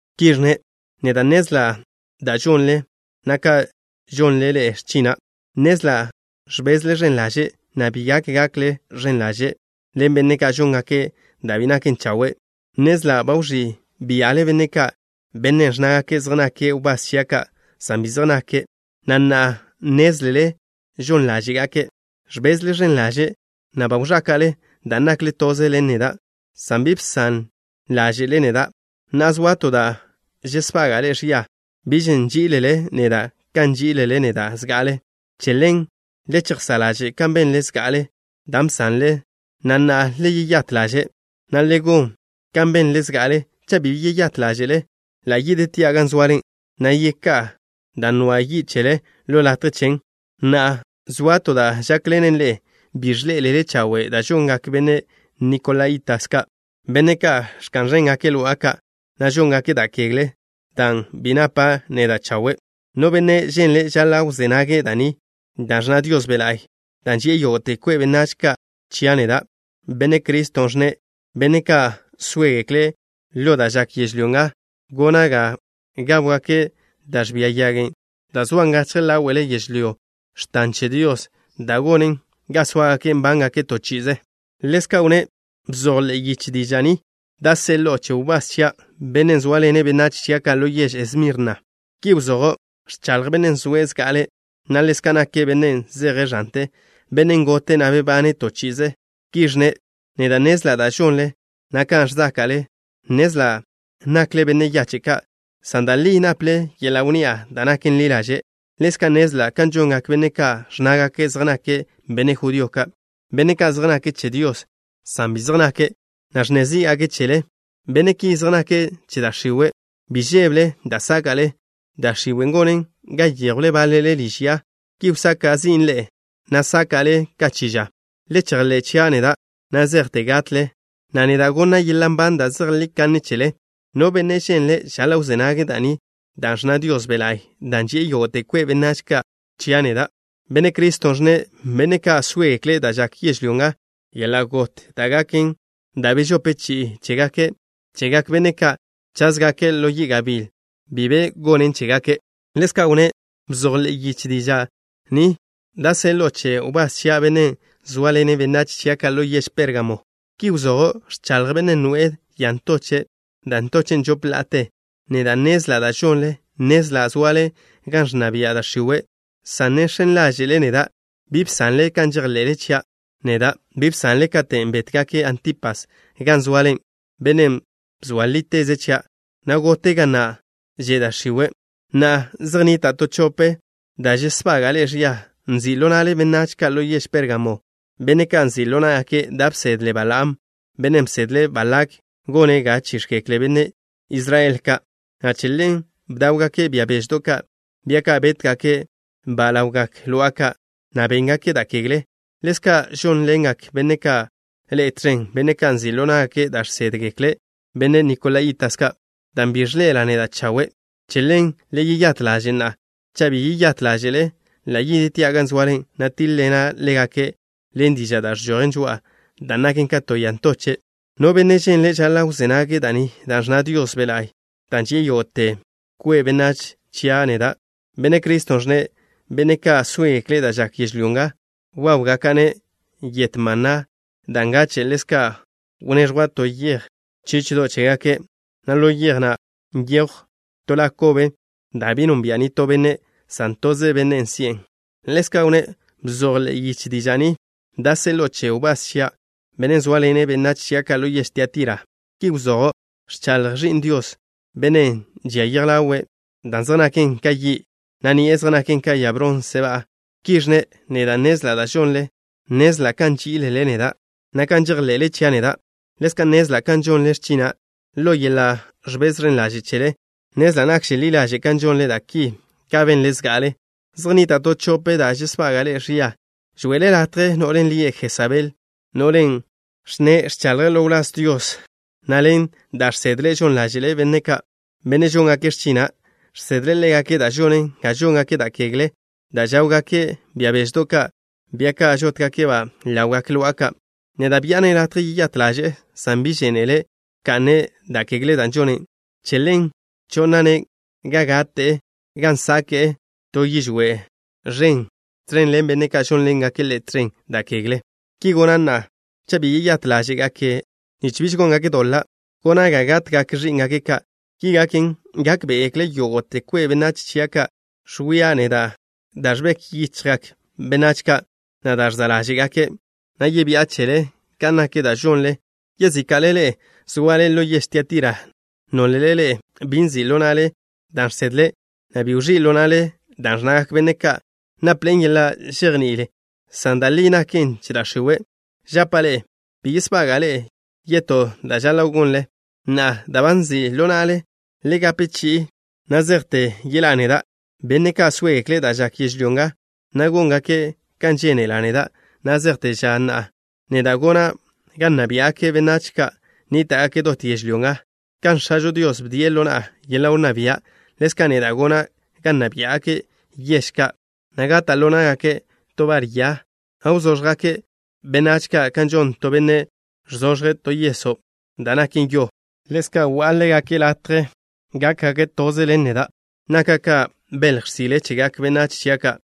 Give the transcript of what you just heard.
Ki ẕnne': Neda' nnezla' da' žonle, na' kan žónḻe'ele x̱china'. Nnezla' ẕbezle ẕen ḻaže', na' bi gak gakle ẕen ḻaže' ḻen benne' ka' žóngake' da' bi naken chawe'. Nnezla' ba wẕí' bia'le benne' ka', benne' ẕnnágake' zej nake' wbás chia' ka', san bi zej nake', na' na'a nnézlele žon ḻáže'gake'. Ẕbezle ẕen ḻaže', na' ba wẕáka'le dan' nakle toze ḻen neda', san bi bsan ḻáže'le neda'. Na'a, zoa to da' žesbaga'a ḻe'e ẕia. Biž nží'ilele neda' kan bží'ilele neda' zga'ale. Che ḻen, le chejsá' ḻaže' kan benle zga'ale, dan' bsanle, na' na'a, le yeyát ḻaže', na' le gon kan benle zga'ale. Cha' bi yeyát ḻáže'le, ḻa' yidtia' gan zoale, na' yeká'a dan' nwan' yi' chele ḻo latje chen. Na'a, zoa to da' žákḻenen ḻe'e. Bi ẕḻé'elele chawe' da' žongak benne' nikolaíta ka', benne' ka' ẕka'n ẕéngake' lo'a ka', na' žóngake' da' kegle, dan' bi napa' neda' chawe'. No benne' ženle' žaḻa' wzé nage' da' ni da' ẕnna Dios Be' La'y, dan' ži'e yógo'te kwe' benách ka' chia' neda', Benne' Cristo, ẕnne': Benne' ka' sóegekle' ḻo da' žak yežlyó nga, gona' ga gáwgake' da' ẕbia yagen' dan' zoan gachje ḻáwe'le yežlyó x̱tan che Dios, dan' gonen ga sóagake' nbángake' to chi'ize.” Ḻezka' wnné': “Bzoj ḻe'e yiche diža' ni da' seḻo'o che wbás chia', bennen' zóaḻene' benách chia' ka' ḻo yež Esmirna. Ki wzojo': Ẕchaḻj Bennen' zoe' zga'ale', na' ḻezka' nake' Bennen' zeje' ẕante, Bennen' gote', na' bebane' to chi'ize. Ki ẕnne': Neda' nnezla' da' žonle, na' kan ẕzáka'le. Nnezla' nakle benne' yache' ka', san da' li naple yeḻa' wnni'a da' naken ḻi ḻaže'. Ḻezka' nnezla' kan žongak benne' ka' ẕnnágake' zej nake' benne' judío ka', benne' ka' zej nake' che Dios, san bi zej nake', na' ẕnne zí'gake' chele. Benne' ki zej nake' che da' x̱iwe'. Bi žébele da' sáka'le. Da' x̱iwen' gonen ga yéjwle báḻele liž ya. Ki wsaka' zin' ḻe'e, na' sáka'le ka chi ža. Le chejḻé' chia' neda' na' zejte gatle, na' neda' gonna' yeḻa' nban da' zejlí kanne chele. No benne' ženle', žaḻa' wzé nage' da' ni da' ẕnna Dios Be' La'y, dan' ži'e yógo'te kwe' benách ka' chia' neda', Benne' Cristo, ẕnne': Benne' ka' sóegekle' da' žak yežlyó nga, yeḻa' got da' gaken da' bežope chi'i chegak benne' ka' cházgake' ḻo yi' gabíl bi be gonen chégake'.” Ḻezka' wnné': “Bzoj ḻe'e yiche diža' ni da' seḻo'o che wbás chia', bennen' zóaḻene' benách chia' ka' ḻo yež Pérgamo. Ki wzojo': Ẕchaḻj Bennen' noe'e ya ntoche', da' ntochen' žop la'ate. Neda' nnezla' da' žonle. Nnezla' zoale gan ẕnna bia' da' x̱iwe', san ne žx̱en ḻáže'le neda'. Bi bsanle kan žejḻe'le chia' neda'. Bi bsanlen katen' bétgake' Antipas gan zoale, bennen' bzoa líteze' chia', na' gote' ga na' že' da' x̱iwe'. Na'a, zej nnita' to chope da' žesbaga'a ḻe'e ẕia. Nzi' ḻo na'le benách ka' ḻo yež Pérgamo, benne' ka' nzi' ḻo ná'gake' da' bsedle Balaam, bennen' bsedle' Balak gone' ga chíx̱gekle benách Israel ka', na' che ḻen bdáwgake' bia beždo' ka', bia ka' bétgake'-ba' ḻawgak lo'a ka', na' béngake' da' kegle. Ḻezka' žónḻengak benne' ka' ḻe'e tẕen, benne' ka' nzi' ḻo ná'gake' da' žsédgekle benne' nikolaíta ka', dan' bi ẕḻe'ela' neda' chawe'. Che ḻen, le yeyát ḻaže' na'a. Cha' bi yeyát ḻáže'le, ḻa' yidtia' gan zoale, na' tíḻ-ḻena' ḻégake' ḻen diža' da' ẕžojen žoa'a, dan' naken ka to ya ntoche'. No benne' ženle', žaḻa' wzé nage' da' ni da' ẕnna Dios Be' La'y, dan' ži'e yógo'te kwe' benách ka' chia' neda', Benne' Cristo, ẕnne': Benne' ka' sóegekle' da' žak yežlyó nga, wáwgaka'-ne' yet maná da' ngache'. Ḻezka' wneẕjwa' to yej chíchedo' chégake', na' ḻo yej na' nyejw to la kobe, da' bi nonbia' nitó benne', san toze bennen' si'en.” Ḻezka' wnné': “Bzoj ḻe'e yiche diža' ni da' seḻo'o che wbás chia', bennen' zóaḻene' benách chia' ka' ḻo yež Tiatira. Ki wzojo': Ẕchaḻj Ẕi'n Dios, Bennen' žia yej ḻawe' dan' zej naken ka yi', na' ni'e zej naken ka ya bronse ba'a. Ki ẕnne': Neda' nnezla' da' žonle. Nnezla' kan nží'ilele neda', na' kan žejḻe'le chia' neda'. Ḻezka' nnezla' kan žonle x̱china' ḻo yeḻa' ẕbez ẕen ḻaže' chele. Nnezla' nakže ḻi ḻaže' kan žonle da' ki ka benle zga'ale. Zej nnita' to chope da' žesbaga'a ḻe'e ẕia. Žwe'ele latje no'len' lie' Jesabel, no'len' ẕnne' ẕchaḻje' ḻo wláz Dios, na' ḻen da' žsedle' žon ḻáže'le' benne' ka', benne' žóngake' x̱china'. Žsedle' ḻégake' da' žonen ga žóngake' da' kegle dan' žáwgake' bia beždo' ka', bia ka' žótgake'-ba' ḻawgak lo'a ka'. Neda' bi'a-ne' latje yeyát ḻaže'e, san bi žénele' wka'ne' da' kegle da' žone'. Che ḻen cho'na'-ne' ga gate'e, gan sake'e to yižwé' ẕen tẕen ḻen benne' ka' žónḻengake' ḻe' tẕen da' kegle. Ki gona' na'a cha' bi yeyát ḻáže'gake' nich biž góngake' doḻa'. Gona' ga gatgak ẕí'ngake' ka'. Ki gaken, gákbe'egekle yógo'te kwe' benách chia' ka' ẕwia' neda' da' ẕbek yichjgak benách ka', na' da' ẕza' ḻáže'gake', na' yebi'a chele kan nak da' žonle. Yezíka'le ḻe'e zoale ḻo yež Tiatira, nólele ḻe'e bi nzi' ḻo na'le dan' žsedle', na' bi wẕí' ḻo na'le dan' ẕnnagak benne' ka' napḻe'en yeḻa' žejní'il, san da' li naken che da' x̱iwe', žapa' ḻe'e: bi yesbaga'a ḻe'e yetó da' žaḻa' gonle. Na'a, dan' ba nzi' ḻo na'le, le gape chi'in na' zejte yeḻá'a neda'. Benne' ka' sóegekle' da' žak yežlyó nga, na' góngake' kan žénela' neda' na' zejte ža na', neda' gona' ga nna biá'gake' benách ka' nníta'gake' dot yežlyó nga. Kan X̱ažo Dios bdie' ḻo na'a yeḻa' wnná bia', ḻezka' neda' gona' ga nna biá'gake' yež ka', na' gata' ḻo ná'gake' to bar ya, na' wzóẕjgake' benách ka' kan žon to benne' ẕzoẕje' to yeso' da' naken yo. Ḻezka' gonna' ḻégake' latje gákgake' toze ḻen neda'. Naka' ka belj x̱sile chegak benách chia' ka'.